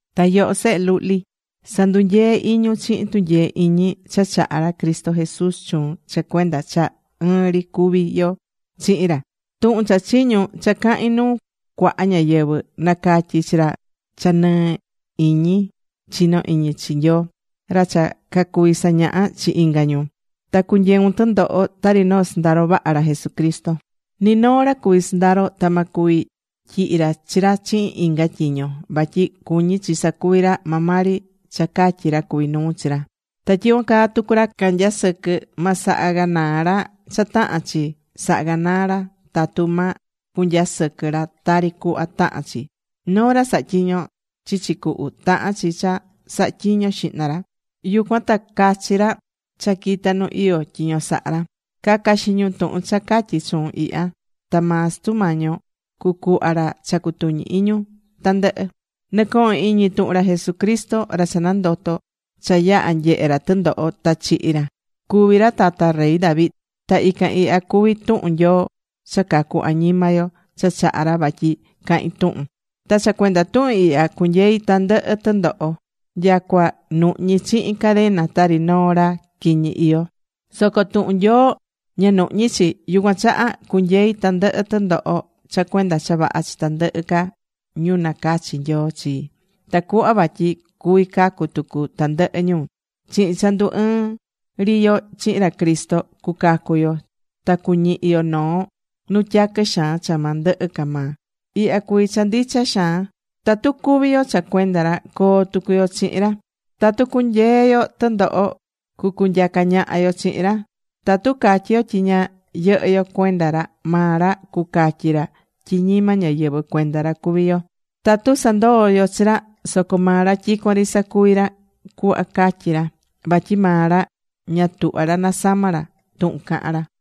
Ta yoho sehe luhli, sa̱ndunyee iñun chihin tunyee iñi cha chahá ra Cristo Jesús chuun cha cuenda cha ɨɨn ri cuví yo chihin ra. Tuhun cha chiñu̱n cha cahi̱n nuu cuaha ñáyɨvɨ, na̱catyi chi ra cha nɨɨ iñi chinó iñi chi Nyoo, ra cha cacuví sañaha chi inga ñu. Ta cu̱nyeun tɨndoho tari noo sɨndaro vaha ra Jesucristo. Ni noo ra cuví sɨndaro ta ma cuvi tyihi ra chi ra chihin inga tyiño. Vatyi cuñí chi sa̱cuvi ra maa maa ri cha catyí ra cuví nuu chi ra. Ta tyicuan caa tucu ra canyasɨquɨ́, ma saha canaa ra cha tahán chi saha canaa ra tatu ma cunyasɨquɨ ra tari cuhva tahán chi. Noo ra sahá tyiño chichi cuhu, tahán chi cha saha tyiño xihna ra, yucuan ta cachi ra cha quitá nu iyó tyiño sahá ra. Ca̱ca xiñun tuhun cha catyí chuun ihya, ta maa Sutu Mañi yo cucuhva ra cha cutuñi iñun tandɨhɨ. Nɨ̱cohon iñi tuhun ra Jesucristo, ra cha nandoto̱ cha yaha̱ nyehe ra tɨndoho ta chihi̱ ra. Cuví ra tata rey David. Ta ican ihya cuví tuhun Nyoo cha cacu añima yo cha chaha̱ ra vatyi cahin tuhun. Ta cha cuenda tuhun ihya cunyeí tandɨhɨ tɨndoho nyacua nuhñí chihin cadena tari noo ra quiñi iyó. Soco tuhun Nyoo ña nuhñí chi. Yucuan chaha cunyei tandɨhɨ tɨndoho cha cuenda cha vaha chi tandɨhɨ ca ñu nacachi̱ Nyoo chi, tacuhva vatyi cuvi cacu tucu tandɨhɨ ñu. Chihin cha ndu ɨɨ̱n ri yo chihin ra Cristo cuacacu yo ta cuñihi yo noo nu tyaquɨ xaan cha ma ndɨhɨ ca maa. Ihya cuví cha ndicha xaan: Tatu cúvi yo cha cuenda ra, coo tucu yo chihin ra. Tatu cunyeé yo tɨndoho, cucunyaca ñaha yo chihin ra. Tatu catyi yo tyi ña yɨhɨ́ yo cuenda ra, maa ra cucatyi ra tyi ñima ñáyɨvɨ cuenda ra cuví chi yo. Tatu sandoo̱ yo chi ra, soco maa ra tyicuan ri sacuví ra cuhva catyí ra. Vatyi maa ra ña tuhvá ra nasama ra tuhun cahán ra.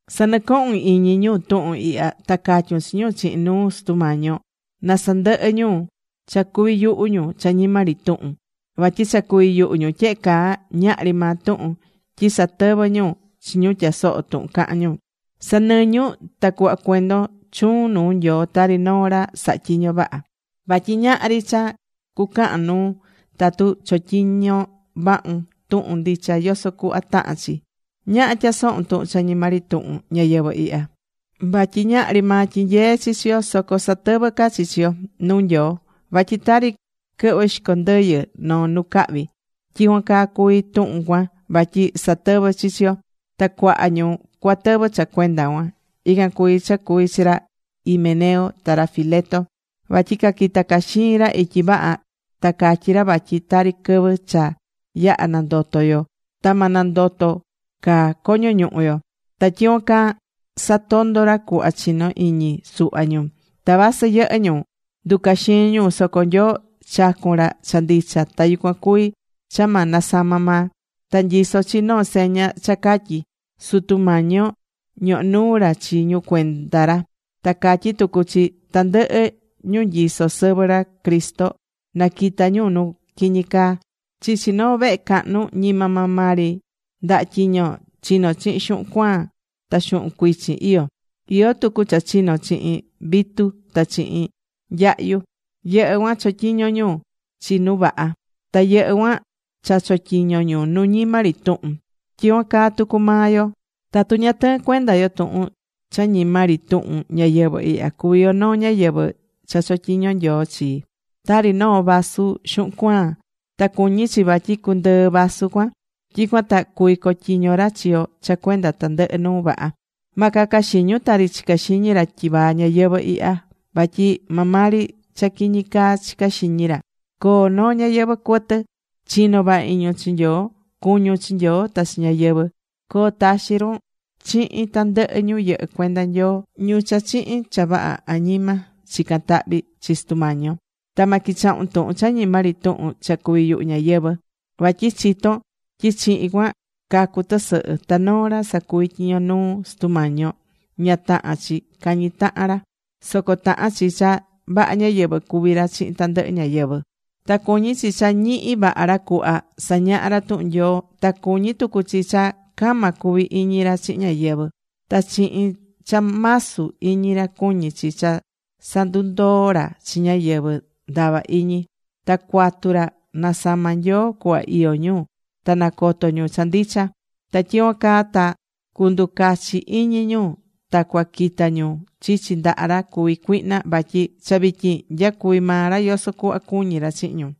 Sa̱nɨcohun iñi ñu tuhun ihya, ta ca̱tyun chi ñu chihin nuu Sutu Mañi yo na sandɨhɨ ñu cha cuví yuhu ñu cha ñima ri tuhun. Vatyi cha cuví yuhu ñu tyehe caa, ñahri maa tuhun. Tyi satɨvɨ́ ñu chi ñu tyasohó tuhun cahán ñu. Sa̱nɨñun ta cu̱hva cuendon chuun nuu Nyoo tari noo ra sahá tyiño vaha. Vatyi ñahri cha cucahan nuun tatu chotyiñó vahun tuhun ndicha yoso cuhva tahán chi. Ñaha tya̱sohun tuhun cha ñima ri tuhun ñayɨvɨ̱ ihya. Vatyi ñahri maa tyinyeé chi chi yo. Soco satɨvɨ́ ca chi chi yo nuu Nyoo vatyi tari quɨhvɨ xico ndɨyɨ noo nu cahvi, tyicuan caa cuví tuhun cuan vatyi satɨvɨ́ chi chi yo. Ta cuaha ñu cuatɨvɨ cha cuenda cuan. Ican cuví cha cuvi̱ chi ra Himeneo ta ra Fileto. Vatyi caquita caxii̱n ra ityi vaha ta catyí ra vatyi tari quɨvɨ cha yaha̱ nandoto yo ta ma nandoto ca coño ñuhu yo. Ta tyicuan caa satondo̱ ra cuhva chinó iñi suhva ñu. Ta vasɨ yɨhɨ́ ñu nducaxii̱n ñu, soco Nyoo chacu̱n ra cha ndicha, ta yucuan cuví cha ma nasama maa. Ta nyisó chi noo seña cha catyí: “Sutu Mañi yo ñohó nuu ra chi ñu cuenda ra.” Ta catyí tucu chi: “Tandɨhɨ ñu nyisó sɨvɨ ra Cristo na quita ñu nu quiñi caa.” Chichi noo vehe cahnu, ñima maa maa ri ndaha tyiño chino̱ chihin xuhun cuaan ta xuhun cuichin iyó. Iyó tucu cha chino chihin vitu ta chihin nyahyu. Yɨhɨ́ cuan chotyiñó ñu chi nu vaha, ta yɨhɨ́ cuan cha chotyiño ñu nu ñima ri tuhun. Tyicuan caa tucu maa yo tatu ña tɨɨ́n cuenda yo tuhun cha ñima ri tuhun ñayɨvɨ̱ ihya, cuví yo noo ñáyɨvɨ cha chotyiñó Nyoo chi, tari noo vaso xuhun cuaan. Ta cuñí chi vatyi cundɨɨ vasu cuan, tyicuan ta cuví cotyiño ra chi yo cha cuenda tandɨhɨ nuu vaha. Ma caca xiñun tari chicá xiñi ra tyivaa ñayɨvɨ̱ ihya. Vatyi maa maa ri cha quiñi caa chicá xiñi ra. Co̱o noo ñayɨvɨ̱ cuɨtɨ. Chi̱no vaha iñun chi Nyoo. Cu̱ñun chi Nyoo ta chi ñáyɨvɨ. Co̱o taxi run chihin tandɨhɨ ñu yɨhɨ́ cuenda Nyoo, ñu cha chihin cha vaha añima chicán tahvi chi Sutu Mañi yo. Ta ma quichahun tuhun cha ñima ri tuhun cha cuví yuhu ñáyɨvɨ. Vatyi chitón tyi chihin cuan cacú tɨsɨhɨ. Ta noo ra sacuví tyiño nuu Sutu Mañi yo, ña tahán chi cañi tahan ra. Soco tahán chi cha vaha ñáyɨvɨ cuvi ra chihin tandɨhɨ ñáyɨvɨ. Ta cuñí chi cha ñihi vaha ra cuhva sañaha ra tuhun Nyoo. Ta cuñí tucu chi cha cama cu̱vi iñi ra chihin ñáyɨvɨ. Ta chihin cha masu iñi ra cuñí chi cha sa̱ndundoo ra chi ñáyɨvɨ ndava iñi. Ta cuatu ra nasama Nyoo cuhva iyó ñu ta nacoto ñu cha ndicha. Ta tyicuan caa ta cunducachi iñi ñu ta cuaquita ñu chichi ndaha ra cuví cuihna vatyi cha vityin nyacuví maa ra yoso cuhva cuñí ra chihin ñu.